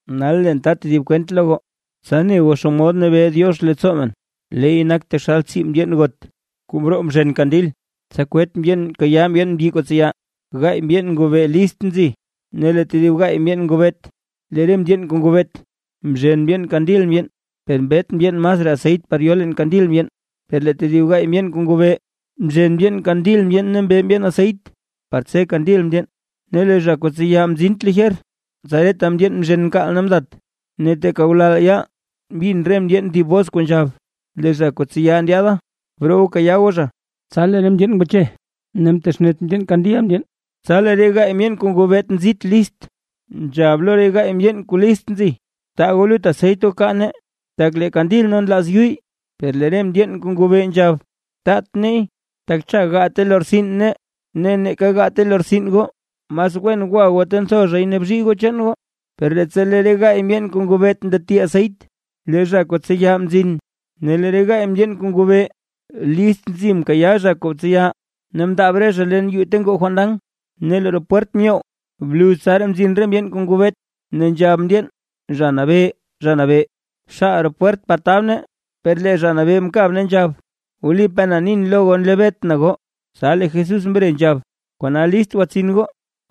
’Nal leen ta tedib kwent lo goo, tsa ne goo naa xomod nabee Diox leettsoo men. Leey nak taxal tsii mndyeen got, kuu mroo mzhen kandil, tsa kwet mndyeen kayaa mndyeen mbyi kuu tseya. Gaay mndyeen ngobee list nzi ne lee tedib gaay mndyeen ngobeet. Lee re mndyeen kuu ngobeet, mzhen mndyeen kandil mndyeen, per mbet mndyeen masraa aseyt par yo leen kandil mndyeen. Per lee tedib gaay mndyeen kuu ngobee, mzhen mndyeen kandil mndyeen ne mbe mndyeen aseyt, par tse kandil mndyeen. Ne lee zha kuu tseya mzint lijer, tsa reta mndyeen mzhen mkaal ne mdat. Ne teeka ngulal yaal mbin re mndyeen thib bos kuu nzhab: “Lee zha kuu tseya ndyaada, broo goo kayaa goo zha”. Tsa lee re mndyeen ngwache ne mtexnet mndyeen kandil mndyeen. Tsa lee re gaay mndyeen kuu ngobeet nzit list, nzhab lo re gaay mndyeen kuu list nzi: “Taa goo lut aseyt goo kaa nee, tak lee kandil nee nlaaz yuyy”. Per lee re mndyeen kuu ngobee nzhab: “Taat neey, tak cha gaate lortsin nee ne neeka gaate lortsin goo. Mas wen gwa goo ta ntho zhay ne bzhii goo chaan goo.” Per leettsa lee re gaay mndyeen kuu ngobeet ndati aseyt, lee zha kuu tseya mzin, ne lee re gaay mndyeen kuu ngobee list nzi mkayaa zha kuu tseya, ne mndaab re zha leen yuu ta ngoo fandan, ne lee roo pwert myoww. Bluz tsaraa mzin re mndyeen kuu ngobeet, ne nzhab mndyeen: “¡Zha Nabee, Zha Nabee, xaal roo pwert par tab nee!” Per lee zha mkab ne nzhab: “Wlipaa na nin lo goo, nlebeetʼn goo”. Tsa lee Jesús mre nzhab: ―Kona list gwatsin goo,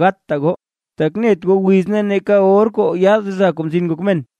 gatta goo, tak net goo wiz ne neeka or kuu yaad Zha Kuu Mzin Ngok Men.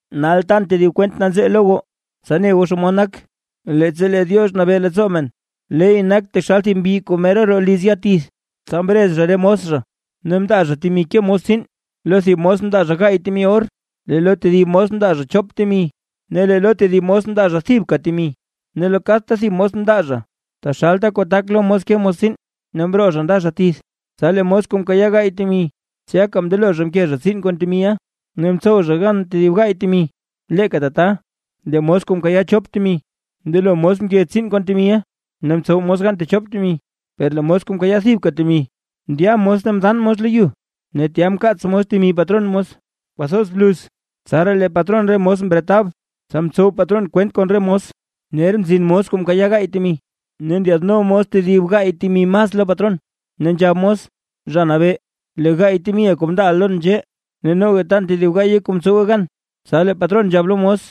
’Nal tan tedib kwent nanzee lo goo, tsa ne goo xomod nak, leettsa lee Diox nabee leettsoo men. Leey nak taxal thib mbyi kuu mera roo liz ya tith. Tsa mrez zha re mos zha ne mndaa zha temi zha ke mos tsiin. Lo thib mos mndaa zha gaay temi or, ne lee lo tedib mos mndaa zha chop temi ne lee lo tedib mos mndaa zha thibka temi, ne lo kadta thib mos mndaa zha taxalta kuu tak lo mos ke mos tsiin. Ne mroo zha nda zha tith. Tsa lee mos kuu mkayaa gaay temi, tsyaka mndelo zha mke zha tsiin kon temiʼa ne mtsow zha gan tedib gaay temi. Leeka tata, lee mos kuu mkayaa chop temi, mndelo mos mke tsiin kon temiʼa, ne mtsow mos gan techop temi. Per lee mos kuu mkayaa thibka temi, ndya mos ne mdaan mos lo yu ne tya mkaats mos temi patron mos. ’Kwathoz bluz tsaraa lee patron re mos mretab. Tsa mtsow patron kwent kon re mos. Ner mzin mos kuu mkayaa gaay temi, ne ndyaadno mos tedib gaay temi mas lo patron, ne nzhab mos: “Zha Nabee, lee gaay temiʼa kuu mndaaʼa lon nzhee, ne noga tan tedib gaaye kuu mtsowe gan”. Tsa lee patron nzhab lo mos: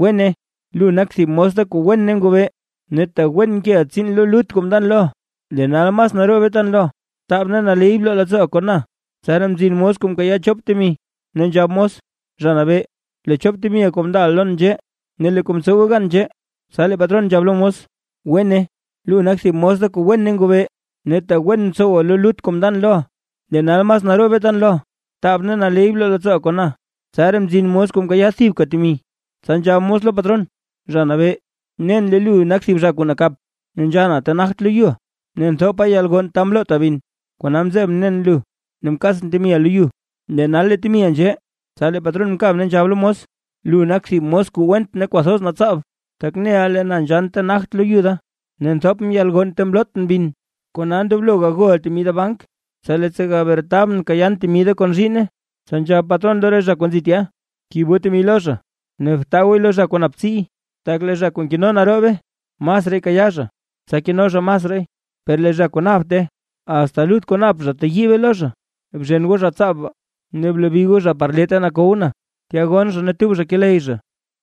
“Wene, lu nak thib mos da kuu wen ne ngobee; ne tak wen mkeʼa tsiin lo lut kuu mndan loʼa, lee nal mas naroobe tan loʼa. Btaab ne naley bloo leettsooʼa kon na.” Tsaraa mzin mos kuu mkayaa chop temi, ne nzhab mos: “Zha Nabee, lee chop temiʼa kuu mndaaʼa lon nzhee, ne lee kuu mtsowe gan nzhee”. Tsa lee patron nzhab lo mos: “Wene, lu nak thib mos da kuu wen ne ngobee; ne tak wen mtsowa lo lut kuu mndan loʼa, lee nal mas naroobe tan loʼa. Btaab ne naley bloo leettsooʼa kon na.” ’Tsaraa mzin mos kuu mkayaa thibka temi, tsa nzhab mos lo patron: “Zha Nabee, nen lee lu nak thib zha kuu nakap, nzhanna ta nagt loyuʼa, ne nthopa yalgonn ta mlota bin. Kona mzebʼn nen lu ne mkaatsʼn temiʼa lo yu. Lee nal lee temiʼa nzhee.” Tsa lee patron mkab ne nzhab lo mos: “Lu nak thib mos kuu went ne kwathoz natsaab, tak neʼa lee na nzhann na ta nagt lo yu da, ne nthopʼn yalgonn ta mlotʼn bin. Kona ndoblo gagoʼa temi da bank, tsa leettsa gabretabʼn gakayaan temi da kon zhiinne.” Tsa nzhab patron lo re zha kuu nzi tya: “Kib goo temi lo zha, ne btaa gooy lo zha kuu nap tsiiy, tak lee zha kuu nkeno naroobe, masraay kayaa zha, tsa keno zha masraay; per lee zha kuu yent kwan nap, asta lut kuu nap zha teyiibe lo zha. Bzhen goo zha tsaab baa, ne blebi goo zha par lee ta nakow na, tya gonn zha ne tub zha keley zha.”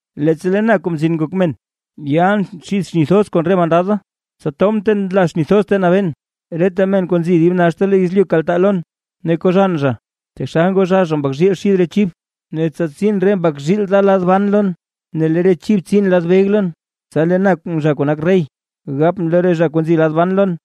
’Leettsa lee na, Kuu Mzin Ngok Men, yalʼn xid xni thoz kon re mandad da, tsa tobʼn ta nla xni thoz ta nabeen. Reta men kuu nzi dib naxta lo yezlyu kaltaa lon, ne koo zhann zha, taxal ngoo zhaa zha mbak zhiil xid re chib. Ne tsa tsin re mbak zhiil da lad ban lon ne lee re chib tsin lad beg lon. Tsa lee na zha kuu nak rey, gapʼn lo re zha kuu nzi lad ban lon: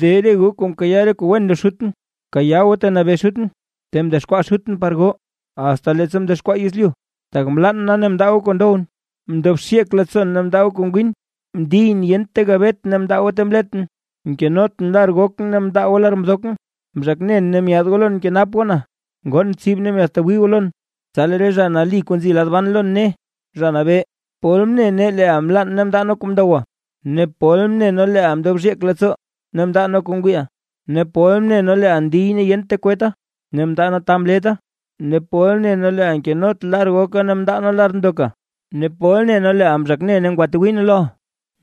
“De goo zha kuu mkayaa re kuu wen lo Xutʼn; bkayaa goo ta nabee Xutʼn, ta mdexkwaa Xutʼn par goo, asta leettsa mdexkwaa yezlyu. Tak mlann na ne mndaa goo kuu ndowʼn, mndob xyeek leettsoon ne mndaa goo kuu ngwin, mndiyʼn ne yent ta gabetʼn ne goo mndaa ta mletʼn, mkenotʼn lar gokʼn ne goo mndaa lar mdokʼn, mzhak nen ne myaad goo lon mkenap goo na, ngoon tsib ne myaadtwii goo lon.” Tsa lee re zha nali kuu nzi lad ban lon ne: “Zha Nabee, ¿pol mne nee leeʼa mlann ne mndaa nee kuu ndowa? ¿Ne pol mne nee leeʼa mndob xyeek leettsoo ne mndaa nee kuu ngwiiʼa? ¿Ne pol mne nee leeʼa ndiy ne yent ta kwetta ne mndaa nee ta mletta? ¿Ne pol ne nee leeʼa nkenot lar goka ne mndaa nee lar mndoka? ¿Ne pol ne nee leeʼa ne mzhaak ne ngwatwii nee loʼa?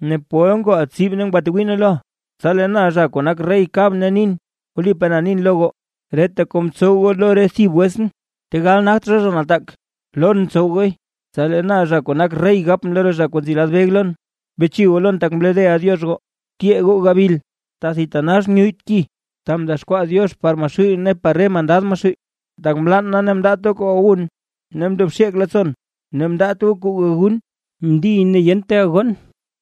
¿Ne pol ngooʼa tsib ne ngwatwii nee loʼa?” Tsa lee na zha kuu nak rey kabʼn ne nin: “Wlipaa na nin lo goo, reta kuu mtsow goo lo re thib wetsʼn, tegal nagt zha zha nataak, lon mtsow gooy”. ’Tsa lee na zha kuu nak rey gapʼn lo re zha kuu nzi lad beg lon: “Beche goo lon tak mlodeʼa Diox goo. Tyee goo gabil, ta thitanax nyuyyt ki, ta mdexkwaa Diox par Maxuuy ne par re mandad Maxuuy. Tak mlann na ne mndaat goo kuu gawun, ne mndob xyeek leettsoon ne mndaat goo kuu gagun. Mndiyʼn yent ta gayoon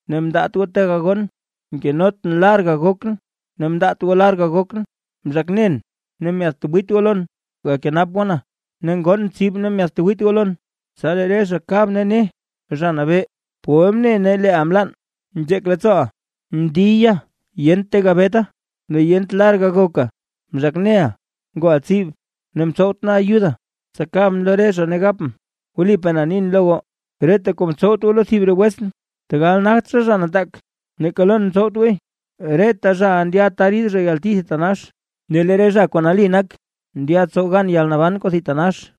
ne mndaat goo ta gayoon. Mkenotʼn lar gagokʼn, ne mndaat goo lar gagokʼn, mzhak nen ne myaadtwiit goo lon gakenap goo na, ne ngoon tsib ne myaadtwiit goo lon.” Tsa lee re zha kab ne: “Zha Nabee, ¿pol mne nee leeʼa mlann, nzheek leettsooʼa, ndiya yent ta gabeta, ne yent lar gagoka, mzhak neʼa, ngooʼa tsib, ne mtsowt nee ayuda?” Tsa kabʼn lo re zha, ne gapʼn: “Wlipaa na nin lo goo, reta kuu mtsowt goo lo thib re wetsʼn, tegal nagt zha zha nataak, neeka lon mtsowt gooy”. Reta zhaʼa ndya ta rid zha yalti thitanax, ne lee re zha kuu nali nak ndya tsow gan yalnaban kuu thitanax.